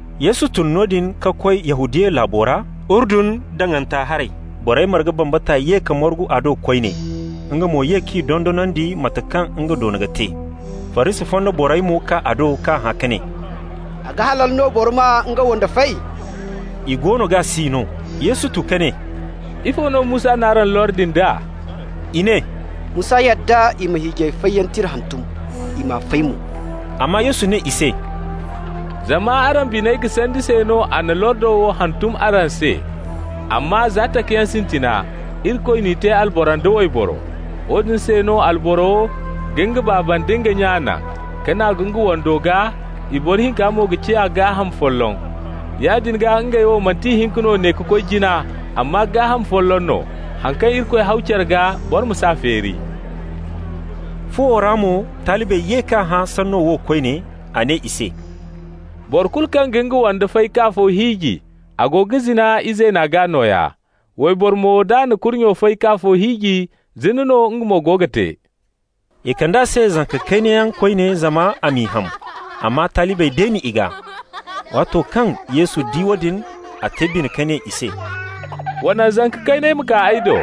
Yesu tun noodin ka koy Yahudiya laabo ra, Urdun daŋanta haray. Borey marga bambata ye ka margu a do koyne. Nga mo ye k'i dondonandi mate kaŋ nga doona ka te. Farisi fonda borey mo kaa a do k'a hã ka ne: «A ga halal no boro ma nga wande fay?» I goono g'a si no. Yesu tu ka ne: «Ifo no Musa n'araŋ lordi nd'a?» I ne: «Musa yadda i ma hiijay fayyaŋ tira hantum, i m'a fay mo.» Amma Yesu ne i se: «Zama araŋ biney ga sandi se no a na lordo wo hantum araŋ se. Amma za takayaŋ sintina, Irikoy n'i te alboro nda wayboro. ‹Woodin se no alboro ga nga baaba nda nga nya naŋ, ka naagu nga wando gaa, i boro hinka mo ga ciya gaaham folloŋ.› Yaadin gaa, ngey wo manti ihinka no ne ka koy jina, amma gaaham folloŋ no. Haŋ kaŋ Irikoy haw care gaa, boro ma s'a feeri.» Fuwo ra mo, talibey ye k'a hã sanno wo koyne. A ne i se: «Boro kulu kaŋ ga nga wande fay k'afo hiiji, a go ga zina izeena gaa nooya. Wayboro mo, d'a na kurnyo fay k'afo hiiji, zina no nga mo go ga te.» I kand'a se zanka kayna yaŋ koyne zama a m'i ham, amma talibey deeni i gaa. Waato kaŋ Yesu di woodin, a te bine ka ne i se: «Wa naŋ zanka kayney ma kaa ay do.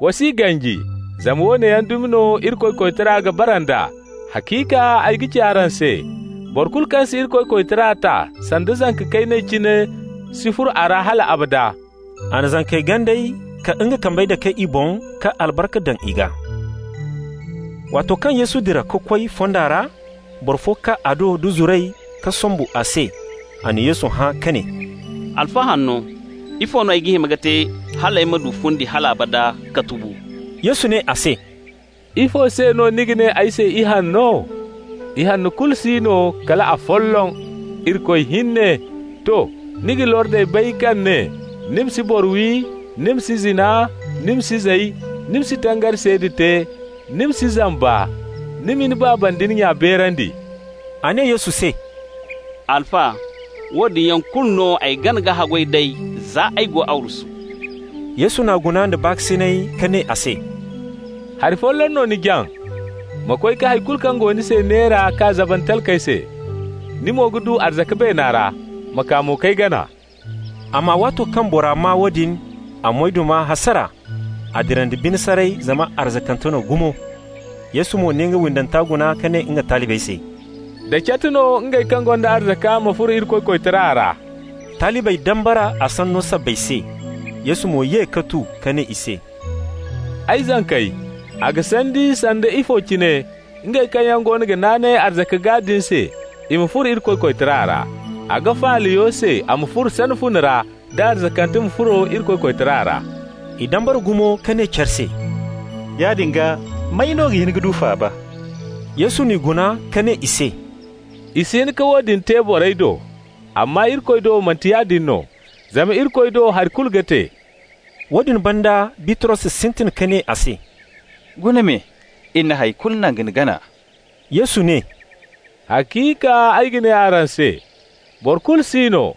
Wa s'i ganji, zama woone yaŋ dumi no Irikoy koytara ga bara nd'a. Haciika ay ga ci araŋ se: boro kulu kaŋ si Irikoy koytara ta sanda zanka kayna cine si furo a ra hal abada.» A na zankey ganday ka nga kambey dake i boŋ, ka albarka daŋ i gaa. Waato kaŋ Yesu dira ka koy fonda ra, boro fo kaa a do da zuray ka sombu a se. A na Yesu hã ka ne: «Alfa hanno, ifo no ay ga hima ka te hal ay ma du fundi hal abada ka tubu?» Yesu ne a se: «Ifo se no ni ga ne ay se ihanno? Ihanno kulu si no kala afolloŋ, Irikoy hinne. To. Ni ga lordey bay kaŋ ne: ‹Ni ma si boro wi, ni ma si zina, ni ma si zay, ni ma si tangari seeda te, ni ma si zamba, ni ma ni baaba nda ni nya beerandi.›» A ne Yesu se: «Alfa, woodin yaŋ kulu no ay gana ka haggoy d'ey za ay go arwasu.» Yesu n'a guna nda baakasinay ka ne a se: «Hari folloŋ no ni jaŋ. Ma koy ka hay kulu kaŋ go ni se neera k'a zaban talkey se -- ni mo ga du arzaka beena ra. Ma kaa mo k'ay gana.» Amma waato kaŋ bora maa woodin, a moyduma hasara. A dira nda bine saray, zama arzakante no gumo. Yesu mo na nga windanta guna ka ne nga talibey se: «Da cat no ngey kaŋ gonda arzaka ma furo Irikoy koytara ra!» Talibey dambara a sanno sabbay se. Yesu mo ye ka tu ka ne i se: «Ay zankey, a ga sandi sanda ifo cine ngey kaŋ yaŋ goono ga naanay arzaka gaa din se, i ma furo Irikoy koytara ra. A ga faala yo se a ma furo sana fune ra, da arzakante ma furo Irikoy koytara ra.» I dambara gumo ka ne care se: «Yaadin gaa, may no ga hin ka du faaba?» Yesu n'i guna ka ne i se: «I si hin ka woodin te borey do, amma Irikoy do manti yaadin no, zama Irikoy do hari kulu ga te.» Woodin banda Bitros sintin ka ne a se: «Guna me, iri na hay kulu naŋ ka ni gana.» Yesu ne: «Haciika ay ga ne araŋ se: boro kulu si no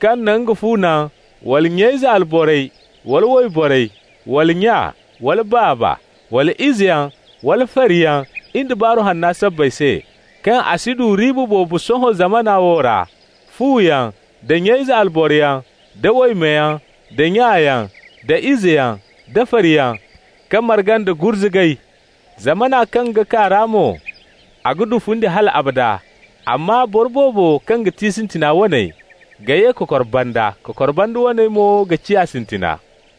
kaŋ na nga fu naŋ, wala nya-ize alborey, wala wayborey, wala nya, wala baaba, wala izeyaŋ, wala fariyaŋ, in da Baaru Hanna sabbay se, kaŋ a si du riiba boobo sohõ zamana wo ra, fuyaŋ, da nya-ize alboroyaŋ, da waymeyaŋ, da nyayaŋ, da izeyaŋ, da fariyaŋ -- ka marga nda gurzugay. Zamana kaŋ ga kaa ra mo, a ga du fundi hal abada. Amma boro boobo kaŋ ga ti sintina waney ga ye kokor banda, kokor banda waney mo ga ciya sintina.»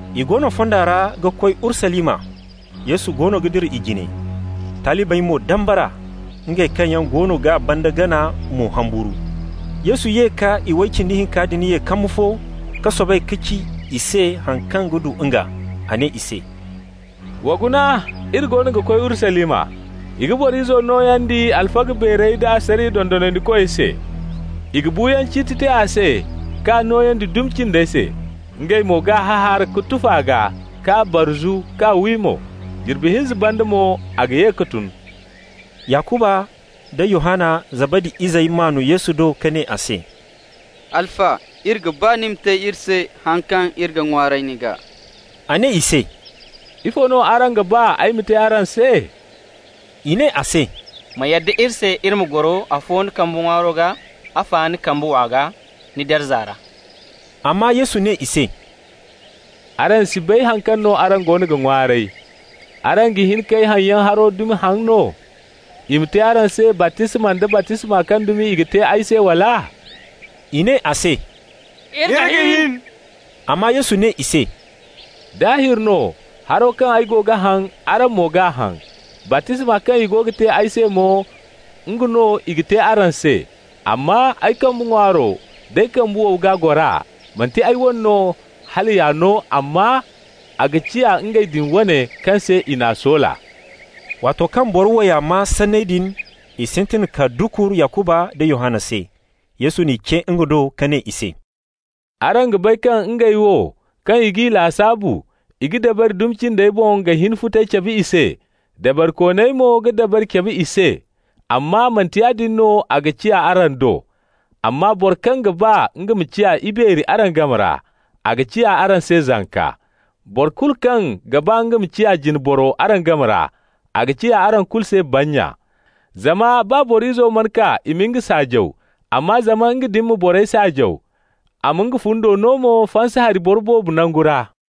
I go no fonda ra ga koy Urusalima. Yesu goono ga dira i jine. Talibey mo dambara. Ngey kaŋ yaŋ goono g'a banda gana mo humburu. Yesu ye ka iway cindi hinka din ye kambu fo ka soobay ka ci i se haŋ kaŋ ga du nga. A ne i se: «Wa guna, iri goono ga koy Urusalima. I ga Boro Izo nooyandi alfaga beerey da asariya dondonandikoy se. I ga buuyaŋ ciiti te a se k'a nooyandi dumi cindey se. Ngey mo g'a hahaara ka tufa a gaa k'a barzu k'a wi mo. Jirbi hinza banda mo a ga ye ka tun.» Yakuba nda Yohanna, Zabadi izey maan Yesu do ka ne a se: «Alfa, iri ga ba ni ma te iri se haŋ kaŋ iri ga ŋwaaray ni gaa.» A ne i se: «Ifo no araŋ ga ba ay ma te araŋ se?» I ne a se: «Ma yadda iri se iri ma goro afo ni kambe ŋwaaro gaa, afa ni kambe wow gaa ni darza ra.» Amma Yesu ne i se: «Araŋ si bay haŋ kaŋ no araŋ goono ga ŋwaaray. Araŋ ga hin k'ay haŋyaŋ haro dumi haŋ no? I ma te araŋ se baptisma nda baptisma kaŋ dumi i ga te ay se, wala?» I ne a se: «Iri ga hin.» Amma Yesu ne i se: «Daahir no, haro kaŋ ay go ga haŋ, araŋ mo g'a haŋ. Baptisma kaŋ i go ga te ay se mo, nga no i ga te araŋ se. Amma ay kambe ŋwaaro d'ay kambe wow gaa gora, manti ay wane no hala y'a no, amma a ga ciya ngey din wane kaŋ se i n'a soola.» Waato kaŋ boro waya maa sanney din, i sintin ka dukur Yakuba nda Yohanna se. Yesu n'i ce nga do ka ne i se: «Araŋ ga bay kaŋ ngey wo kaŋ i g'i lasaabu i ga dabari dumi cindey boŋ ga hin futay cabe i se. Dabarikooney mo ga dabari cabe i se. Amma manti yaadin no a ga ciya araŋ do. Amma boro kaŋ ga ba nga ma ciya ibeeri araŋ game ra, a ga ciya araŋ se zanka. Boro kulu kaŋ ga ba nga ma ciya jine boro araŋ game ra, a ga ciya araŋ kulu se bannya. Zama baa Boro Izo mana kaa i ma nga saajaw, amma zama nga din ma borey saajaw, a ma nga fundo no mo fansa hari boro boobo nangu ra.»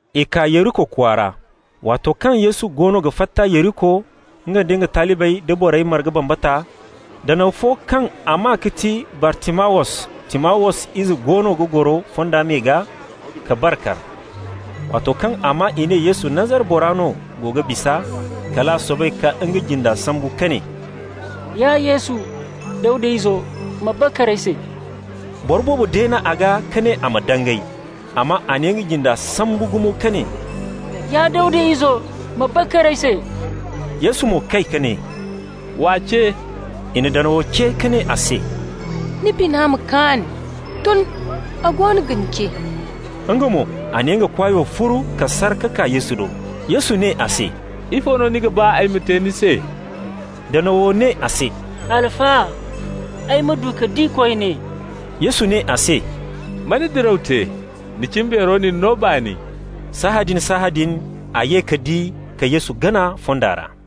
I kaa Yeriko kwaara. Waato kaŋ Yesu goono ga fatta Yeriko, nga nda nga talibey nda borey marga bambata, danaw fo kaŋ a maa ga ti Bartimawus, Timawus ize goono ga goro fonda me gaa ka bar kar. Waato kaŋ a maa i ne Yesu, Nazara bora no go ga bisa, kal a soobay ka nga jinda sambu ka ne: «Ya Yesu, Dawda Izo, ma bakar ay se!» Boro boobo deen'a gaa ka ne a ma dangay, amma a na nga jinda sambu gumo ka ne: «Ya Dawda Izo, ma bakar ay se!» Yesu mo kay ka ne: «W'a ce.» I na danawo ce ka ne a se: «Ni bina ma kaan. Tun, a goono ga ni ce.» Nga mo, a na nga kwaayo furu, ka sar ka kaa Yesu do. Yesu ne a se: «Ifo no ni ga ba ay ma te ni se?» Danawo ne a se: «Alfa, ay ma du ka di koyne.» Yesu ne a se: «Ma ni diraw te. Ni cimbeero na ni no baani.» Sahãadin-sahãadin a ye ka di ka Yesu gana fonda ra.